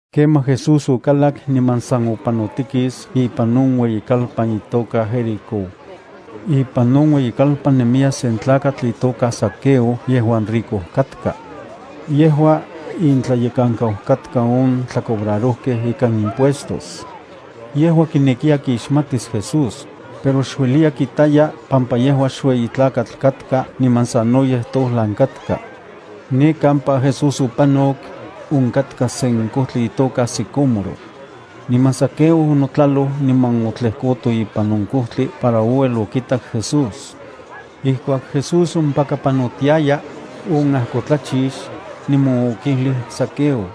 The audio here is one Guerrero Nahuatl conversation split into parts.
Kemaj Jesús okalak niman san opanotikis ipan on ueyikalpan itoka Jericó. Ipan on ueyikalpan nemiya sen tlakatl itoka Zaqueo yejuan rico katka. Yejua intlayekankau katka on tlacobrarojkej ikan impuestos. Yejua kinekiya kitas akinon Jesús, pero xueliya kitaya pampa yejua xueyi tlakatl katka niman sanoyej tojlan katka. Ne kampaka Jesús opanok, onkatka sen kojtli itoka sicómoro. Niman Zaqueo onotlaloj niman otlejkoto ipan on kojtli para ouel okitak Jesús. Ijkuak Jesús ompaka panotiaya, onajkotlachix, niman okijlij Zaqueo: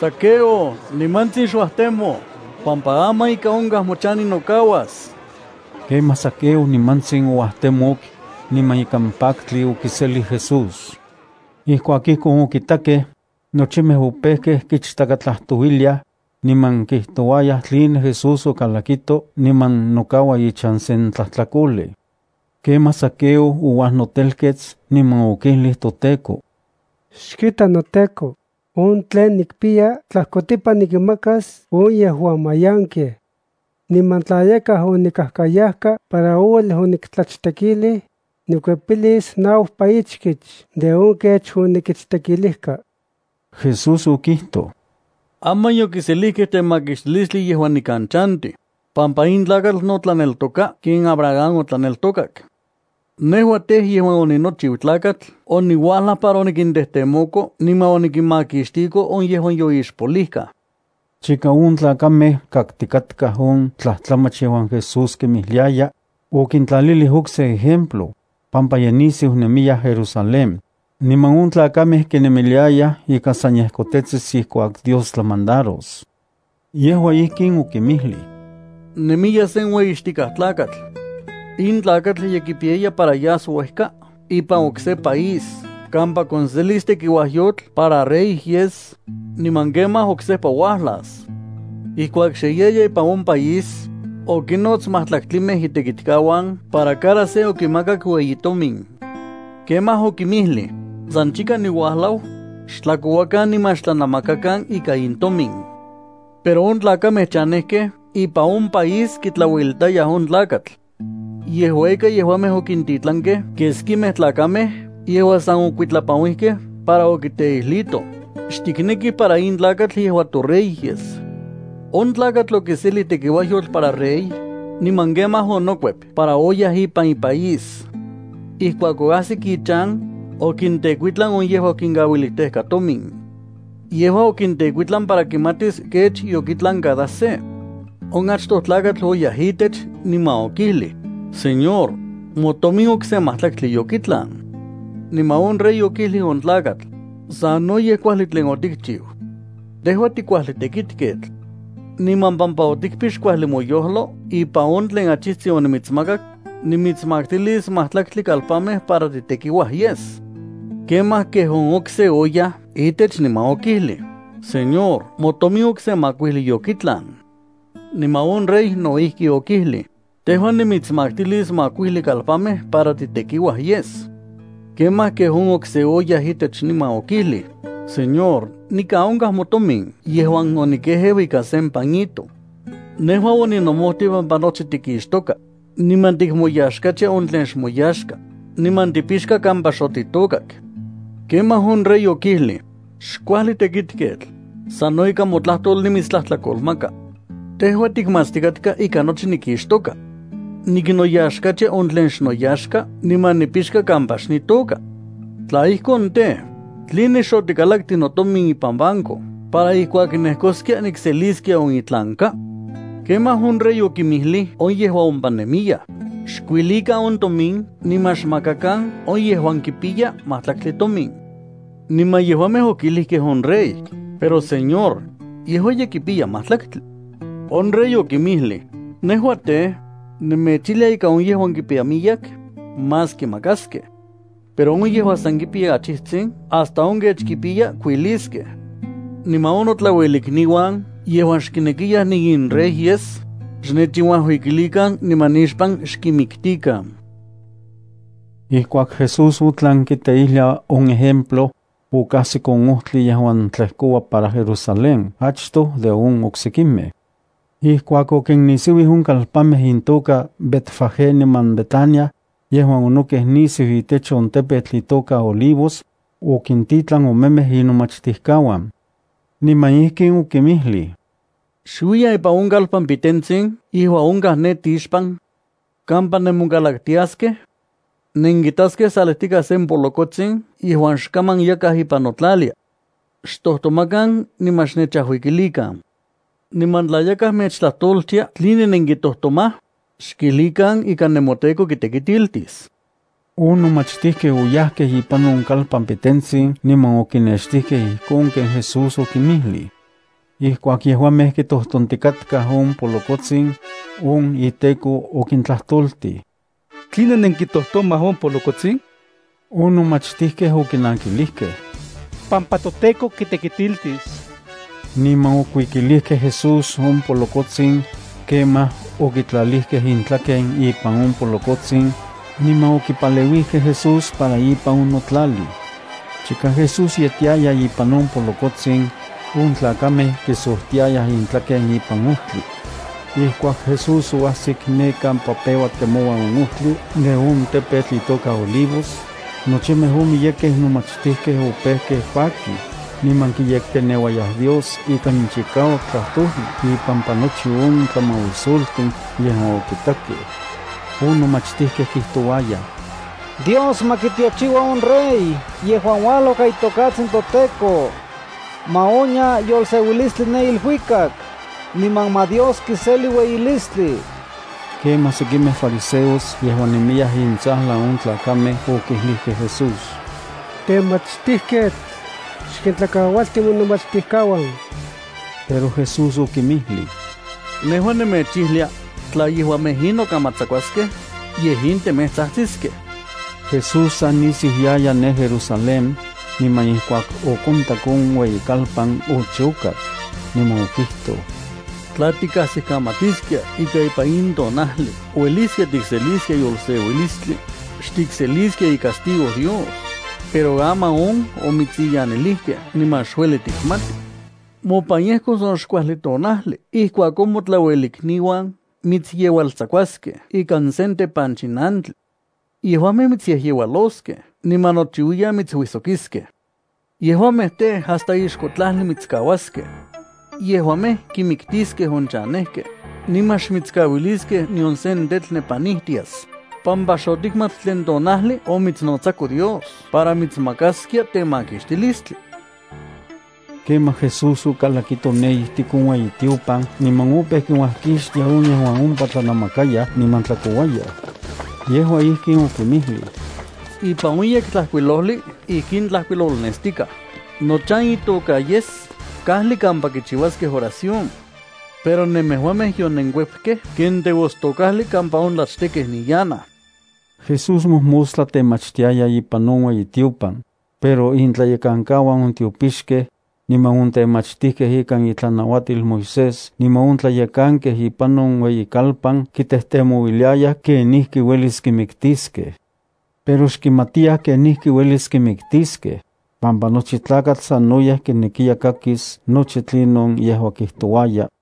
—Zaqueo, nimantsin xuajtemo, pampa aman ika onkaj mochan ninokauas. Kemaj Zaqueo nimantsin ouajtemok, niman ikan paktli okiselij Jesús. Ijkuak ijkon okitakej, nochimej opejkej kichtakatlajtouiliaj, niman kijtouayaj tline Jesús okalakito niman nokaua ichan sen tlajtlakolej. Kemaj Zaqueo ouajnotelkets niman okijlij toTEKO: —Xkita noTEKO, on tlen nikpiya tlajkotipan nikinmakas on yejuan mayankej. Niman tla yakaj onikajkayajka para ouel oniktlachtekilij, nikuepilis naupa ichkich de on kech onikichtekilijka. Jesús okijtoj: —Aman yokiselijkej temakixtilistli yejuan nikan chantij, pampa in tlakatl no tlaneltoka ken Abraham otlaneltokak. Nejua tej, yejuan oninochiu Tlakatl oniuajlaj para onikintejtemoko niman onikinmakixtiko on yejuan yoixpolijkaj. Chika on tlakamej kaktikatkaj on tlajtlamach yejuan Jesús kinmijliaya, okintlalilij okse ejemplo, pampa ye nisiu nemiya Jerusalén, niman on tlakamej kinemiliayaj ika san yejkotetsis ijkuak Dios tlamandaros. Yejua ijkin okinmijlij: —Nemiya sen ueyixtikaj tlakatl. In tlakatl ye kipiyaya para yas uejka ipan okse país kampa konselis tekiuajyotl para rey yes, niman kemaj oksejpa uajlas. Ijkuak xe yaya ipan on país, okinnots majtlaktlimej itekitkauan para cada se okimakak ueyi tomin. Kemaj okinmijlij: “San chika niuajlau, xtlakouakan niman xtlanamakakan ika in tomin.” Pero on tlakamej chanejkej ipan on país kitlauelitayaj on tlakatl. Yejua ika, yejuamej okintitlankej keskimej tlakamej yejuan san okuitlapanuijkej para okiteijlitoj: “Xtiknekij para in tlakatl yejua torey yes.” On tlakatl okiselij tekiuajyotl para rey, niman kemaj onokuep para oyaj ipan ipaís. Ijkuak oajsik ichan, okintekuitlan on yejuan okinkauilijtejka tomin. Yejua okintekuitlan para kimatis kech yokitlan cada se. On achtoj tlakatl oyaj itech, niman okijlij: “Señor, motomin okse majtlaktli yokitlan.” Niman on rey okijlij on tlakatl: “Sanoyej kuajli tlen otikchiu. Tejua tikuajli tekitketl. Niman pampa otikpix kuajli moyojlo ipan on tlen achijtsin onimitsmakak, nimitsmaktilis majtlaktli kalpanmej para titekiuaj yes.” Kemaj, kej on okse oyaj itech niman okijlij: “Señor, motomin okse makuijli yokitlan.” Niman on rey no ijki okijlij: “Tejua nimitsmaktilis makuijli kalpanmej para titekiuaj yes.” Kemaj, kej on okse oyaj itech niman okijlij: “Señor, nikan onkaj motomin yejuan onikejeu ikan sen pañito. Nejua oninomojtij pampa nochi tikixtoka, niman tikmoyaxkatia on tlen xmoyaxka, niman tipixka kampa xotitôkak.” Kemaj on rey okijlij: “¡Xkuajli tekitketl! Sano ikan motlajtol nimitstlajtlakolmaka. Tejua tikmatstikatka ika nochi nikixtoka. Niknoyaxkatia on tlen xnoyaxka niman nipixka kampa xnitôka. Tla ijkon tej, ¿tline xotikalaktij notomin ipan banco para ijkuak nejkoskia nikseliskia on itlanka?” Kemaj on rey okinmijlij on yejuan ompa nemiyaj: “Xkuilikan on tomin niman xmakakan on yejuan kipiya majtlaktli tomin.” Niman yejuamej okijlijkej on rey: “Pero Señor, yejua ye kipiya majtlaktli.” On rey okinmijlij: “Nejua, tej, nemechijlia ika on yejuan kipiya miyek, más kimakaskej. Pero on yejuan san kipiya achijtsin hasta on kech kipiya kuiliskej. Niman on notlauelikniuan yejuan xkinekiyaj niinrey yes, xnechinuajuikilikan niman nixpan xkinmiktikan.” Ijkuak Jesús otlan kiteijlia on ejemplo, okajsik on ojtli yejuan tlejkoua para Jerusalén achto de on oksekimej. Ijkuak okinnisiuij on kalpanmej intoka Betfagé niman Betania, yejuan onokej nisiu itech on tepetl itoka Olivos, okintitlan omemej inomachtijkauan, niman ijkin okinmijlij: —Xuiyan ipan on kalpan pitentsin yejuan onkaj ne tixpan. Kampa nemonkalaktiaskej, nenkitaskej salijtikaj sen polokotsin yejuan xkaman yakaj ipan notlalia. Xtojtomakan niman xnechajuikilikan. Niman tla yakaj mechtlajtoltia tline nenkitojtomaj, xkijlikan ika nemoTEKO kitekitiltis. On nomachtijkej oyajkej ipan on kalpan pitentsin niman okinextijkej ijkon ken Jesús okinmijlij. Ijkuak yejuamej kitojtontikatkaj on polokotsin, on iteko okintlajtoltij: —¿Tline nenkitojtomaj on polokotsin? On nomachtijkej okinankilijkej: —Pampa toTEKO kitekitiltis. Niman okuikilijkej Jesús on polokotsin. Kemaj okitlalijkej intlaken ipan on polokotsin, niman okipaleuijkej Jesús para ipan onotlalij. Chika Jesús yetiaya ipan on polokotsin, on tlakamej kisojtiayaj intlaken ipan ojtli. Ijkuak Jesús oajsik ne kampa peua temoua on ojtli de on tepetl itoka Olivos, nochimej on miyekej nomachtijkej opejkej pakij, niman kiyekteneuayaj Dios ikan chikauak tlajtoli ipampa nochi on tlamauisoltin yejuan okitakej. On nomachtijkej kijtouayaj: —¡Dios ma kitiochiua on Rey yejuan uajlau ikan itokatsin toTEKO! ¡Ma onya yolseuilistli ne iluikak, niman ma Dios kiseli ueyilistli! Kemaj sekimej fariseos yejuan nemiyaj intsajlan on tlakamej okijlijkej Jesús: —Temachtijketl, xkintlakaualti monomachtijkauan. Pero Jesús okinmijlij: —Nejua nemechijlia, tla yejuamej in nokamatsakuaskej, yej in temej tsajtsiskej. Jesús sa nisiu yaya ne Jerusalén, niman ijkuak okontak on ueyikalpan, ochokak, niman okijtoj: —¡Tla tikajsikamatiskia ika ipan in tonajli ueliskia tikseliskia yolseuilistli, xtikseliskia icastigo Dios! Pero aman on omitsiyanilijkej niman xueli tikmati. Mopan yejkos on xkuajli tonajli ijkuak on motlauelikniuan mitsyeualtsakuaskej ikan sen tepanchinantli. Yejuamej mitsyejyeualoskej niman nochiuiyan mitsuijsokiskej. Yejuamej tej, hasta ixko tlajli mitskauaskej. Yejuamej kinmiktiskej on chanejkej, niman xmitskauiliskej nion sen tetl nepanijtias, pampa xotikmat tlen tonajli omitsnotsako Dios para mitsmakaskia temakixtilistli. Kemaj Jesús okalakito ne ijtik on ueyitiopan niman opeu kinuajkixtia on yejuan ompa tlanamakayaj niman tlakouayaj. Yejua ijkin okinmijlij: —Ipan on Yektlajkuilojli ijkin tlajkuilolnestikaj: “Nochan itoka yes kajli kampa kichiuaskej oración.” Pero nemejuamej yonenkuepkej ken teostokajli kampa on tlachtekej niyanaj. Jesús mojmostla temachtiaya ipan on ueyitiopan, pero intlayekankauan on tiopixkej, niman on temachtijkej ikan itlanauatil Moisés niman on tlayekankej ipan on ueyikalpan kitejtemouiliayaj kenijki uelis kimiktiskej. Pero xkimatiyaj kenijki uelis kimiktiskej, pampa nochi tlakatl sanoyej kinekiya kakis nochi tlinon yejua kijtouaya.